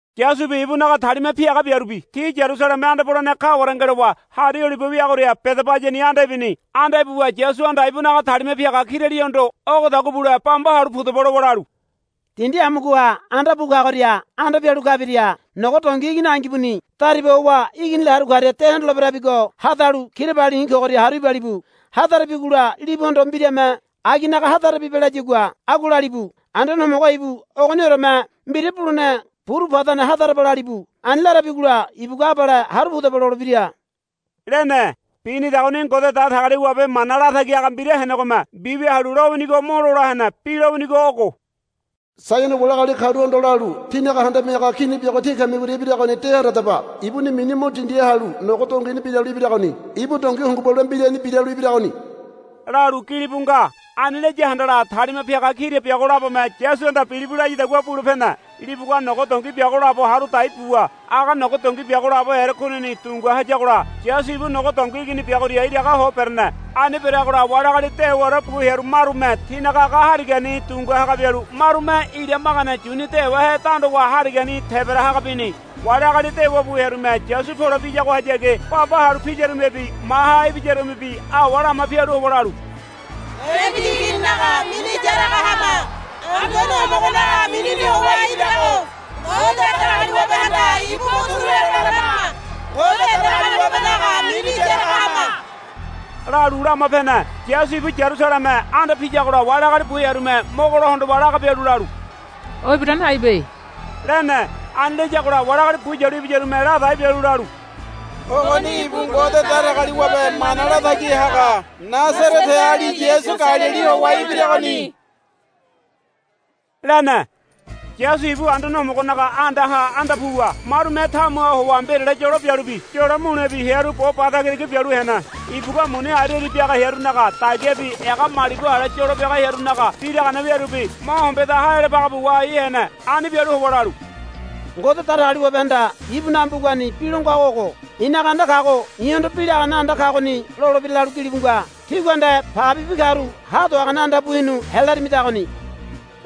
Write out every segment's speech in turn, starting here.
Yasubi ibunaga talima piaga biarubi ti Yarusaleme anda polene kaware ngelowa Hari Olibe weagoria Bedabayani anda ibini. Anda ibuwa Yasuhanda ibunaga talima piaga kiralihondo, Ogodagua bule bamba halu pudaba, lowa lalu, Dindi amugoha anda bu kagoria anda pialu kabiria nogo dongi igini angibuni dariba howa iginila halu karia de hondoleberabigo hadalu kirabali i̱ kogoria haru ibalibu. Hadarabigola libuhondo mbirame aginaga hadarabibe layagua agua lalibu. Anduane Homogo ibu ogonioreme mbira bulene buru padane hadaraba, lalibu. Ani larabigola ibugua, Abale haru pudaba, lolebira, lene. Binidagoni Ngode Datagaliwabe mana latagi haga mbira henegome mbiwia halu lowinigo mo lola hene. Bi lowinigo ogo, Saiono wali agali karuhondo lalu, Tínaga Handame Haga Kini biago tí kamigoria ibiragoni de handadaba. Ibuni mini mo dindiha halu nogo dongini biralu ibiragoni. Ibu dongi hungubalua mbirani biralu ibiragoni, lalu gilibu nga. Ani laya handala talima piaga kira biago labome Yasuhanda, Bilibu, layadagua bule pene. Libugua nogo dongi biago labo haru dai buwa aga nogo dongi biago labo erekunini dungua hayagola Yasu ibu nogo dongi igini biagoria iraga ho berene. Ani bereagola wali agali dewaore bu hearu marume tinaga aga harigani dungua haga bialu marume ira magane yuni dewahe dandowa harigani tebara haga bini. Wali agali dewa bu hearume Yasu pole piyagohayagi bamba halu piyarumebi maha ibiyarumebi awa lama pialu howa lalu, Debidi Igininaga mini yaraga hama. Anduane Homogonaga minini howa ibirago Ngode Datagaliwabehanda ibu mo turu helo larama. Ngode Datagaliwabenaga mini yaraga hama, lalu lama pene. Yasu ibu Yarusaleme anda piyagola wali agali bu hearume mogo lo hondowa laga bialu lalu, O ibiragoni aibe, lene. Ani layagola wali agali bu yalu ibiyarume ladai bialu lalu, Ogoni ibu Ngode Datagaliwabe mana latagi haga Nasareteali Yasu Galili howa ibiragoni, lene. Yasu ibu Anduane Homogonaga andaha anda puwa marume tamuha howa mbirale yolo bialubi yolo mulebi hearu bo ba tagitagi bialu hene. Ibugua muni ariari biaga hearunaga dagiabi ega malibu ale yolo biaga hearunaga biragane wiarubi mo hombeda haealabagabu wahai hene. Ani bialu howa lalu, Ngode Datagaliwabehanda ibunaga mbugani bi lo ngago ogo, I̱naga anda kago i̱hondo bi lagane anda kagoni lolebira, lalu gilibu nga. Tígua nde pagebibi karu ha do hagane anda bu hinu helarimidagoni,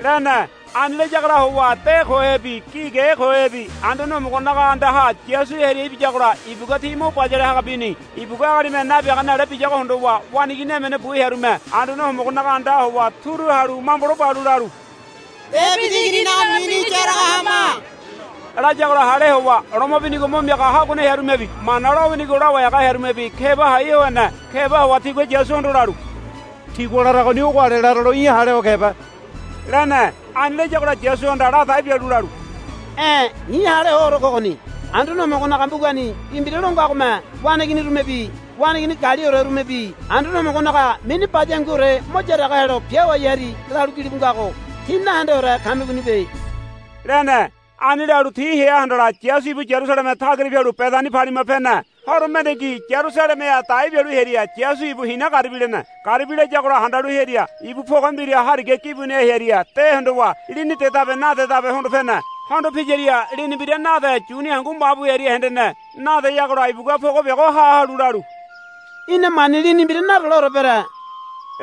lene. Ani layagola howa de kohebi gi ge kohebi Anduane Homogonaga andaha Yasu hearia ibiyagola ibugua ti mo bayale haga bini. Ibugua agalime nabiagane ale biyago hondowa waneigini emene bu hearume Anduane Homogonaga andaha howa turu halu mambolo balu lalu, Debidi Igininaga mini yaraga hama, layagola hale howa loma binigo mo miaga haguane hearumebi Mana lowinigo lawai haga hearumebi keba hai ho hene. Keba howa tigua Yasuhondo lalu, Tigua laragoni ogo ale laralo í̠ hale ho kebe, lene. Ani layagola Yasuhanda ladai bialu lalu, E̱ i̱ hale hoore kogoni. Anduane Homogonaga mbugani bi mbira lo ngagome, Waneiginirumebi waneigini galiorerumebi Anduane Homogonaga mini baya hanguore mo yaraga helo biawai hari, lalu gilibu ngago tí nahendeore kamigonibe, lene. Ani lalu ti hea handala Yasu ibu Yarusaleme tagira pialu Bedani palima pene. Horo mendengi Yarusalemeha dai bialu hearia Yasu ibu hina garibi lene. Garibi layagola handalu hearia ibu poge mbira hariga gibuniha hearia de hondowa lini dedabe nadedabe hondo pene. Hondo piyaria lini mbira nade yuni hangu ma bu hearia hendene. Nadeyagola ibugua poge biago ha halu lalu, Í̠na mani lini mbira nadoleore bere,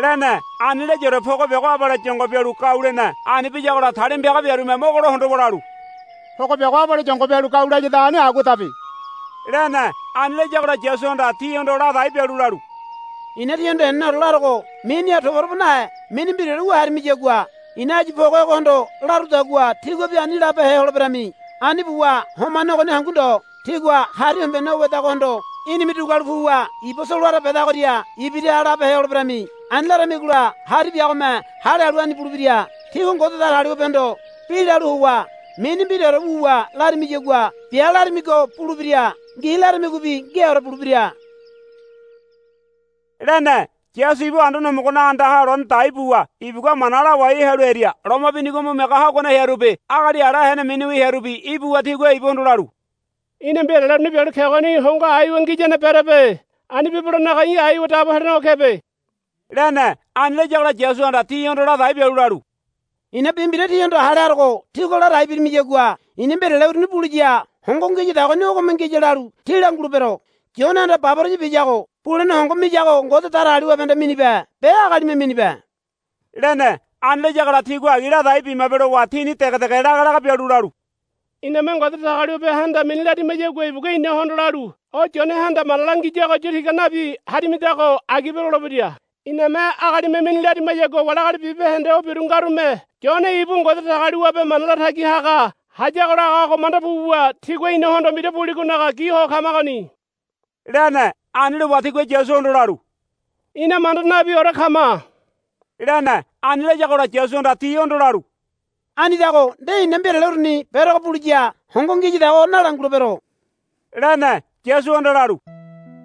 lene. Ani layaore poge biago abale yongo bialu gau lene. Ani biyagola talima piaga biarume mogolo hondowa lalu, Poge biago abale yongo bialu gau layadagoni aguadabe, lene. Ani layagola Yasuhanda tihondo ladai bialu lalu, I̱na tíhondo heneneore larogo miniha toba toba nahe mini mbiraore wu harimiyagua i̱na áyu poge ogohondo larudagua tíguabi ani labehe holeberami. Ani buwa homane ogoni hangu ndo tígua hari hombene o wedagohondo, Í̠nime dugualu puwa iba solowara bedagoria ibiraha, labehe holeberami. Ani laramigola hari biagome hale halu ani bulebira. Tígua Ngode Datagaliwabehondo bi lalu howa mini mbiraore wuwa larimiyagua bia laramigo bulebira ngi laramigobi ngiaore bulebira, lene. Yasu ibu Anduane Homogonaga andaha lone dai buwa ibugua mana lawai halu hearia loma binigo mo miaga haguane hearubi agali ala hene miniwi hearubi ibuwa tigua ibuhondo lalu, Í̠na mbirale uruni bialu kegoni hongo aiwa ngiyane berebe. Ani bibelonaga í̠ aiwa dabo helenego kebe, lene. Ani layagola Yasuhanda tihondo ladai bialu lalu, I̱na bi mbira tíhondo hale harogo tígua ladai birimiyagua i̱na mbirale uruni buliya hongo ngiyadagoni ogome ngiya lalu tí langulebero. Yonehanda baboraya biyago bulene hongo miyago Ngode Datagaliwabehanda minibe be agalime minibe, lene. Ani layagola tigua, Agi ladai bimabe, lowa tini dege dege laga laga bialu lalu, Iname Ngode Datagaliwabehanda mini larimayagua ibugua inahondo lalu, O Yonehanda mana langiyago yu tiga nabi harimidago agibe, lolebira. Iname agalime mini larimayagua wali agali bibahende o biru ngarume Yone ibu Ngode Datagaliwabe mana latagi haga hayago lagago manda buwa tigua inahondo mbira buligonaga gi ho kamagoni, lene. Ani lowa tigua Yasuhondo lalu, Ina manda nabiore kama, lene. Ani layagola Yasuhanda tihondo lalu, Anidago nde i̱na mbirale uruni berogo buliya hongo ngiyadago nalangulebero, lene. Yasuhanda lalu,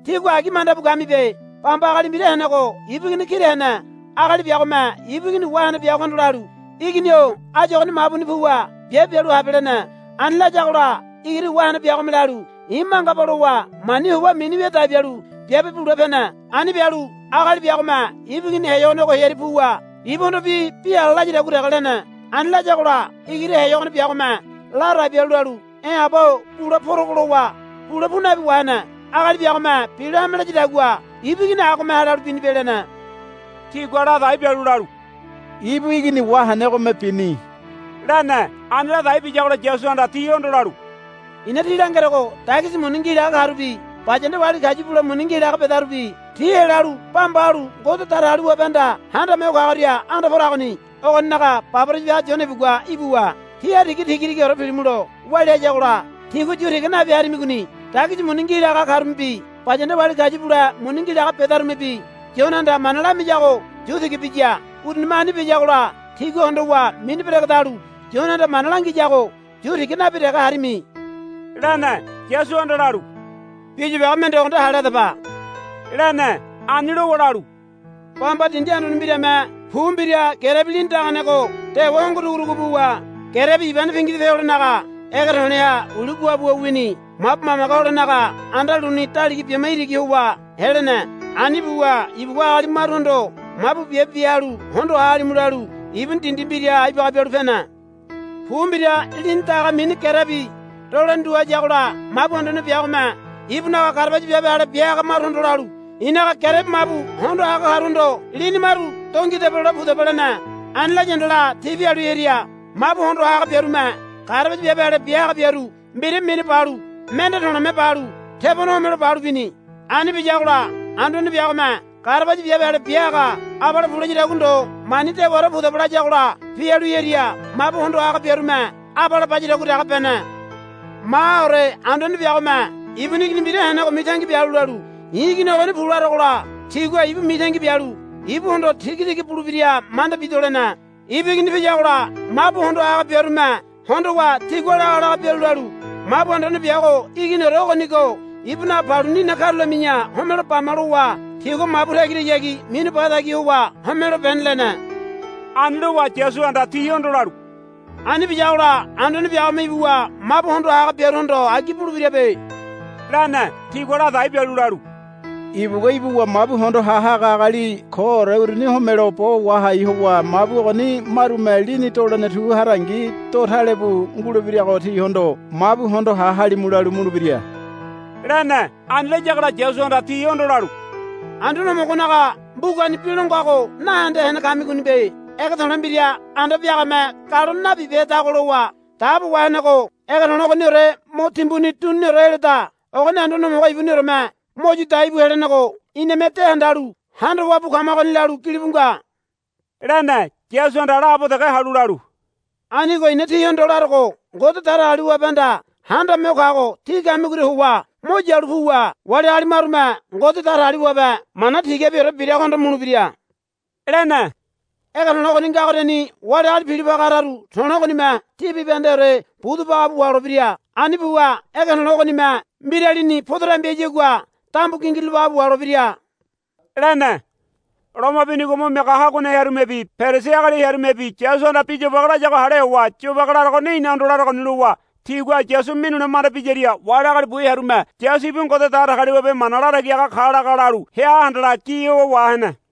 Tígua agi manda bu kamibe. Bamba agali mbira henego ibu igini kira hene. Agali biagome ibu igini wahene biagohondo lalu, Igini-o áyu ogoni mabuni puwa biabe bialu habe, lene. Ani layagola igiri wahene biagome lalu, I̱ mangaba, lowa mani howa mini wia dai bialu biabe bule pene. Ani bialu agali biagome ibu igini heyogonego hearia puwa ibuhondobi bi ala layadagua dege lene. Ani layagola igiri heyogone biagome ladai bialu lalu, E̱ aba-o bule porogo, lowa bule pu nabi wahene. Agali biagome bilo hame layadagua ibu igini agome hale halu binibe, lene. Tigua ladai bialu lalu, Ibu igini wahenegome bini, lene. Ani ladai biyagola Yasuhanda tihondo lalu, I̱na tí langerogo dagisi muni ngi laga karubi bayanda wali kayu bule muni ngi laga bedarubi tí helalu bamba halu Ngode Datagaliwabehanda Handame Ho Kagoria anda poragoni. Ogoninaga baboraya biaga Yone ibugua ibuwa tí hariga tiga tigaore pilimulo walia hayagola tígua yu tiga nabi harimigoni. Dagisi muni ngi laga karumebi bayanda wali kayu bule muni ngi laga bedarumebi Yonehanda mana lamiyago yu tiga biya. Urunime ani biyagola tígua hondowa mini beregedalu Yonehanda mana langiyago yu tiga nabi dege harimi, lene. Yasuhanda lalu, Bi yobage mende ogo nde hale hadaba, lene. Ani lowa lalu, Bamba dindi anduane mbirame pu mbira gerebi lini daganego dewa hongo dugudugu buwa gerebi ibane pingidope holenaga ege to̱le̱ha uli guabuwa wini. Mabu mamage holenaga anda luni daliga bima iraga howa helene. Ani buwa ibugua agali maruhondo, Mabu biabe bia halu hondo ha halimu, lalu ibuni dindi mbiraha ibaga bialu pene. Pu mbira lini daga mini gerebi dolene tu hayagola mabu anduane biagome ibunaga garabaya biabe ale bia haga maruhondo lalu, I̱naga gerebi mabu hondo ha haga karuhondo lini maru do ngidaba lole pudaba, lene. Ani laya handala ti pialu hearia mabu hondo ha haga biarume garabaya biabe ale bia haga biaru mbira minu balu mende to̱le̱me balu tebone homelo balu bini. Ani biyagola anduane biagome garabaya biabe ale bia haga abale pu layadagua ndo mani dewaore pudaba layagola pialu hearia mabu hondo ha haga biarume abale bayadagua dege bene. Mahaore anduane biago ibuni igini mbira henego mitangi bialu lalu, I̱ igini ogoni pu larogola tigua ibu mitangi bialu ibuhondo tiga tiga bulebira manda bido, lene. Ibu igini piyagola mabu hondo ha haga biarume hondowa tigua laga laga bialu lalu, Mabu anduane biago iginiore ogonigo ibunaga paluni ina karulami̱ya homelo bama, lowa tigua mabu tagirahayagi minu ba tagi howa homelo bene, lene. Ani lowa Yasuhanda tihondo lalu, Ani biyagola anduane biagome ibuwa mabu hondo ha haga biaruhondo agi bulebirabe, lene. Tigua ladai bialu lalu, Ibugua ibuwa mabu hondo ha haga agali koore uruni homelo bo wahai howa mabu ogoni marume lini dolene tu harangi do tale bu ngulebirago tihondo, Mabu hondo ha halimu, lalu mulebira, lene. Ani layagola Yasuhanda tihondo lalu, Anduane Homogonaga mbugani bi longago nahende hene kamigonibe. Ege to̱le̱ mbira anda biagame galone nabibehedago lowa dabo wahenego ege to̱le̱ ogoniore mo timbuni duniniore heleda. Ogoni Anduane Homogo ibunioreme mo yu dai bu helenego iname de handalu handawa bu kamagoni, lalu gilibu nga, lene. Yasuhanda laabo dege halu lalu, Anigo i̱na tíhondo larogo Ngode Datagaliwabehanda Handame Ho Kago tí kamigoria howa mo yalu puwa wali agali marume Ngode Datagaliwabe mana tigabiore biragohondo mulebira, lene. [ Ege to̱le̱ ogoni ngagoriani wali agali pilo paga hararu to̱le̱ ogonime ti bibahendeore budu baga bu waholebira. Ani buwa ege to̱le̱ ogonime mbiralini podo dambi hayagua dambu gingirulo baga bu waholebira, lene.] Loma binigo mo miaga haguane hearumebi Perisi agali hearumebi Yasuhanda bi yobage layago hale howa, Yobage laragoni inahondo laragoni, lowa tigua Yasu minule manda biyaria wali agali bu hearume Yasu ibu Ngode Datagaliwabe mana latagi haga ka laga lalu hea handala gi howa wahene.